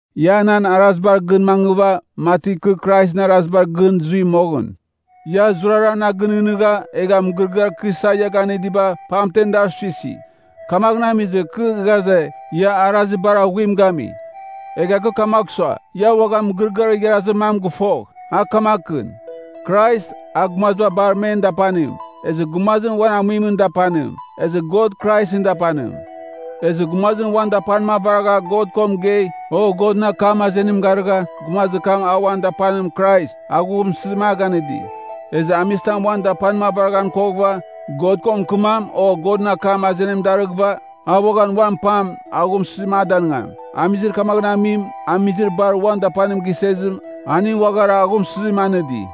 Ia nan arazibar gɨn mangɨva, mati kɨ Kraisɨn arazibar gɨn zui moghɨn. Ia zurara na ginɨghnɨgha, egha mɨgɨrɨgɨar kɨ isa ia ganɨdiba, pamtem dar suisi. Kamaghɨn amizɨ, kɨ ghaze, ia arazir bar aghuim gami. Egha kɨ kamagh sua, ia uaghan mɨgɨrɨgɨar igharazir mam gɨfogh, a kamakɨn: Krais, a gumaziba bar men dapanim, ezɨ gumazim uan amuimɨn dapanim, ezɨ God Kraisɨn dapanim. Ezɨ gumazim uan dapanim avaragha God ko mɨgei, o Godɨn akam azenim garɨgha, gumazir kam a uan dapanim Krais, aghumsɨzim a ganɨdi. Ezɨ amizitam uan dapanim avaraghan koghɨva, God ko mɨkɨmam, o Godɨn akam azenim darɨghɨva, a uaghan uan pam, aghumsɨzim a danɨngam. Amizir kamaghɨn amim, amizir bar uan dapanim gisezim, aning uaghara aghumsɨzim anɨdi.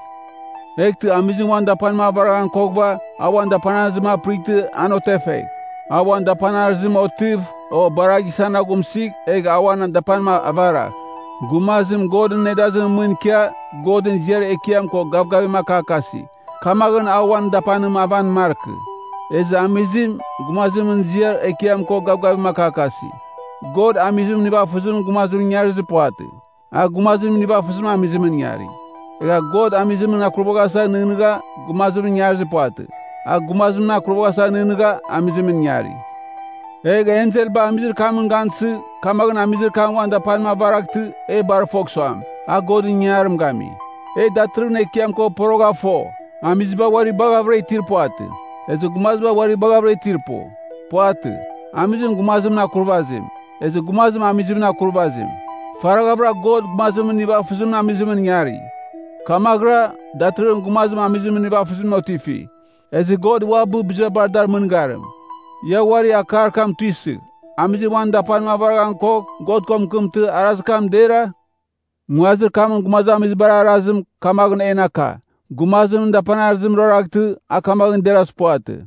Eghtɨ amizim uan dapanim avaraghan koghɨva, a uan dapanarɨzim apɨrightɨ an otefegh. A uan dapanarɨzim otɨv, o bar a gisan aghumsɨgh, egh a uan dapanim avaragh. Gumazim Godɨn nedazimɨn mɨn ikia, Godɨn ziar ekiam ko gavgavim akakasi, kamaghɨn a uan dapanim avan markɨ. Ezɨ amizim, gumazimɨn ziar ekiam ko gavgavim akakasi. God amizimɨn nivafɨzimɨn gumazimɨn ingarizir puvatɨ. A gumazimɨn nivafɨzimɨn amizimɨn ingari. Egha God amizimɨn akurvaghasa nɨghnɨgha, gumazimɨn ingarizir puvatɨ. A gumazimɨn akurvaghasa nɨghnɨgha, amizimɨn ingari. Egh enselba amizir kam gansɨ, kamaghɨn amizir kam uan dapanim avaraghtɨ, e bar fogh suam, a Godɨn ingangarim gami. E datɨrɨghɨn Ekiam ko porogha fo, amiziba uari baghavɨra itir puvatɨ, ezɨ gumaziba uari baghavɨra itir pu. Puvatɨ. Amizim gumazimɨn akurvazim, ezɨ gumazim amizimɨn akurvazim. Faraghavɨra God gumazimɨn nivafɨzimɨn amizimɨn ingari. Kamaghɨra, datɨrɨghɨn gumazim amizimɨn nivafɨzimɨn otifi. Ezɨ God uabɨ, biziba bar dar mɨngarim. Ia uari akar kam tuisɨgh, amizim uan dapanim avaraghan kogh, God ko mɨkɨmtɨ, arazir kam dera? Nguazir kamɨn gumazamizibar arazim, kamaghɨn en aka, gumazimɨn dapanarɨzim ruaraghtɨ, a kamaghɨn derazir puvatɨ.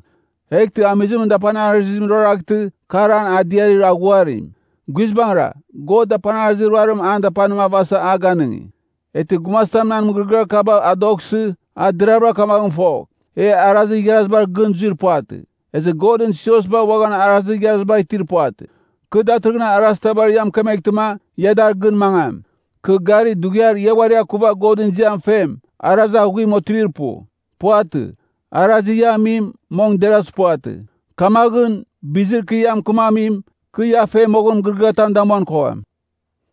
Eghtɨ amizimɨn dapanarɨzim ruaraghtɨ, kar an adiarir aghuarim. Guizbangɨra, God dapanarɨzir ruarim an dapanim avasa a ganɨngi. Eghtɨ gumazitam nan mɨgɨrɨgɨar kaba adoghsɨ, a deravɨra kamaghɨn fogh, e arazir igharazitabar gɨn zuir puvatɨ, ezɨ Godɨn siosba uaghan arazir igharaziba itir puvatɨ. Kɨ datɨrɨghɨn arazitabar ia mɨkemeghtɨma, ia dar gɨn mangam. Kɨ gari, dughiar ia uari akuva Godɨn ziam fem, arazir aghuim otivir pu. Puvatɨ, arazir ia amim, mong derazir puvatɨ. Kamaghɨn, bizir kɨ ia mɨkɨmamim, kɨ ia fe moghɨn mɨgɨrɨgɨatam damuan kogham.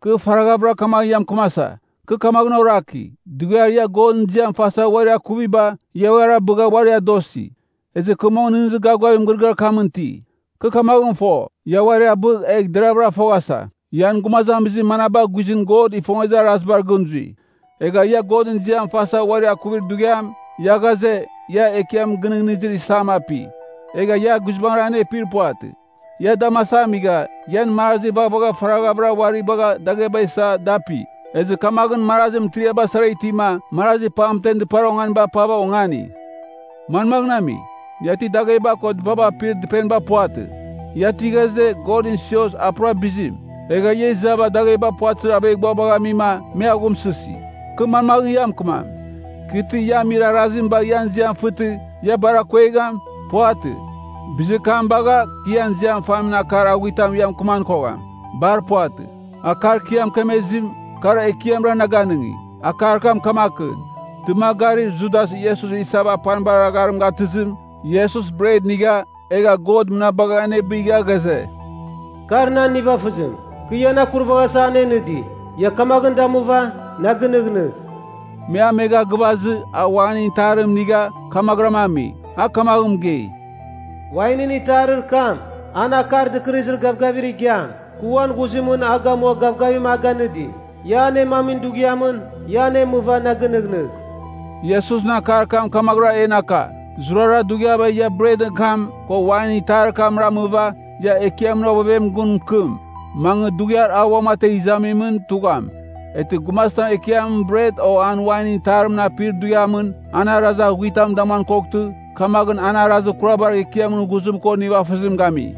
Kɨ faraghavɨra kamaghɨn ia mɨkɨmasa, kɨ kamaghɨn oraki, dughiar ia Godɨn ziam fasa uari akuviba, ia uari abɨgha uari adosi. Ezɨ kɨ mong nɨghnɨzir gavgavim mɨgɨrɨgɨar kamɨn iti. (Kɨ kamaghɨn fo, ia uari abɨgh, egh deravɨra foghasa, ian gumazamizir manaba guizɨn God ifongezir arazibar gɨn zui.) Egha ia Godɨn ziam fasa uari akuvir dughiam, ia ghaze, ia Ekiam Gɨnɨghnɨzir Isam api. Egha ia guizbangɨra anepir puvatɨ. Ia damasava amigha, ian marazi vaghvagha faraghavɨra uari bagha dagheba isa da api. Ezɨ kamaghɨn marazi mɨtiriaba sara itima, marazi pamtemɨn dɨpar onganiba apava ongani. Manmaghɨn ami? Ia ti dagheba ko dɨpaba apir dɨpeniba puvatɨ? Ia ti ghaze, Godɨn sios, a pura bizim? Egha ia izava dagheba puvatɨzir aveghbuabagh amima, me aghumsɨsi. Kɨ manmaghɨn ia mɨkɨmam? Kɨ ti ia amir arazim bagh ian iziam fɨtɨ, ia bar akongegham? Puvatɨ. Bizir kam bagha, kɨ ian ziam famin akar aghuitamɨn ia mɨkɨman kogham. Bar puvatɨ. Akar kɨ ia mɨkemezim, kar Ekiamra na ganɨngi. Akar kam kamakɨn: Dɨmagarir Judas Iesus isava apanibar agharim gatɨzɨmɨn, Iesus bret inigha, egha God mɨnabagha anebigha ghaze, “Kar nan nivafɨzim, kɨ ian akurvaghasa anenɨdi. Ia kamaghɨn damuva, na ginɨghnɨgh.” Me amegha gɨvazɨ, a wainɨn itarim inigha, kamaghɨram ami. A kamaghɨn mɨgei, “Wainɨn itarir kam, an Akar Dɨkɨrɨzir Gavgavir Igiam, kɨ uan ghuzimɨn a gamua gavgavim a ganɨdi. Ia anemamin dughiamɨn, ia anemɨva na ginɨghnɨgh.” Iesusɨn akar kam kamaghɨra en aka, zurara dughiaba ia bretɨn kam, ko wainɨn itarir kam ramɨva, ia Ekiamɨn ovevemɨn gun mɨkɨm, mangɨ dughiar a uamategh izamimɨn tugham. Eghtɨ gumazitam Ekiamɨn bret o an wainɨn itarimɨn apir dughiamɨn, an arazir aghuitam damuan koghtɨ, kamaghɨn an arazir kurabar Ekiamɨn ghuzim ko nivafɨzim gami.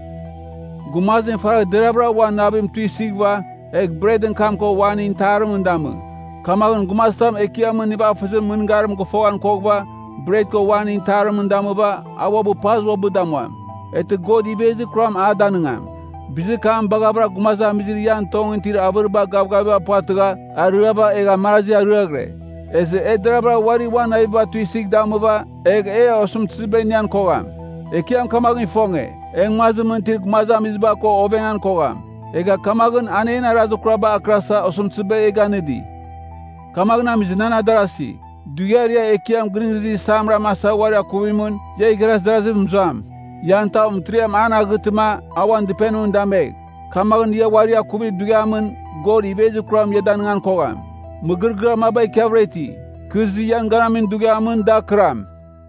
Gumazim faragh deraghvɨra uan navim tuisɨghɨva, egh bretɨn kam ko wainɨn itarimɨn damɨ. Kamaghɨn gumazitam Ekiamɨn nivafɨzimɨn mɨngarim gɨfoghan koghɨva, bret ko wainɨn itarimɨn damɨva, a uabɨ paz uabɨ damuam, eghtɨ God ivezir kuram a danɨngam. Bizir kam baghavɨra gumazamizir ian tongɨn itir avɨriba gavgavim puvatɨgha, ariava egha marazi ariaghɨre. Ezɨ e deravɨra uari uan naviba tuisɨgh damɨva, egh e osɨmtɨziba inian kogham. Ekiam kamaghɨn ifonge, e nguazimɨn itir gumazamiziba ko ovengan kogham. Egha kamaghɨn an en arazir kuraba akɨrasa osɨmtɨziba e ganɨdi. Kamaghɨn amizɨ nan adarazi, dughiar ia Ekiam Gɨnɨghnɨzir Isam ramasa uari akuvamimɨn, ia igharaz adaraziv zuam. Ian tav mɨtiriam an aghɨtɨma, a uan dɨpenimɨn damegh. Kamaghɨn ia uari akuvir dughiamɨn, God ivezir kuram ia danɨngan kogham. Mɨgɨrɨgɨar maba ikiavɨra iti, kɨ izɨ ian ganamin dughiamɨn, da akɨram.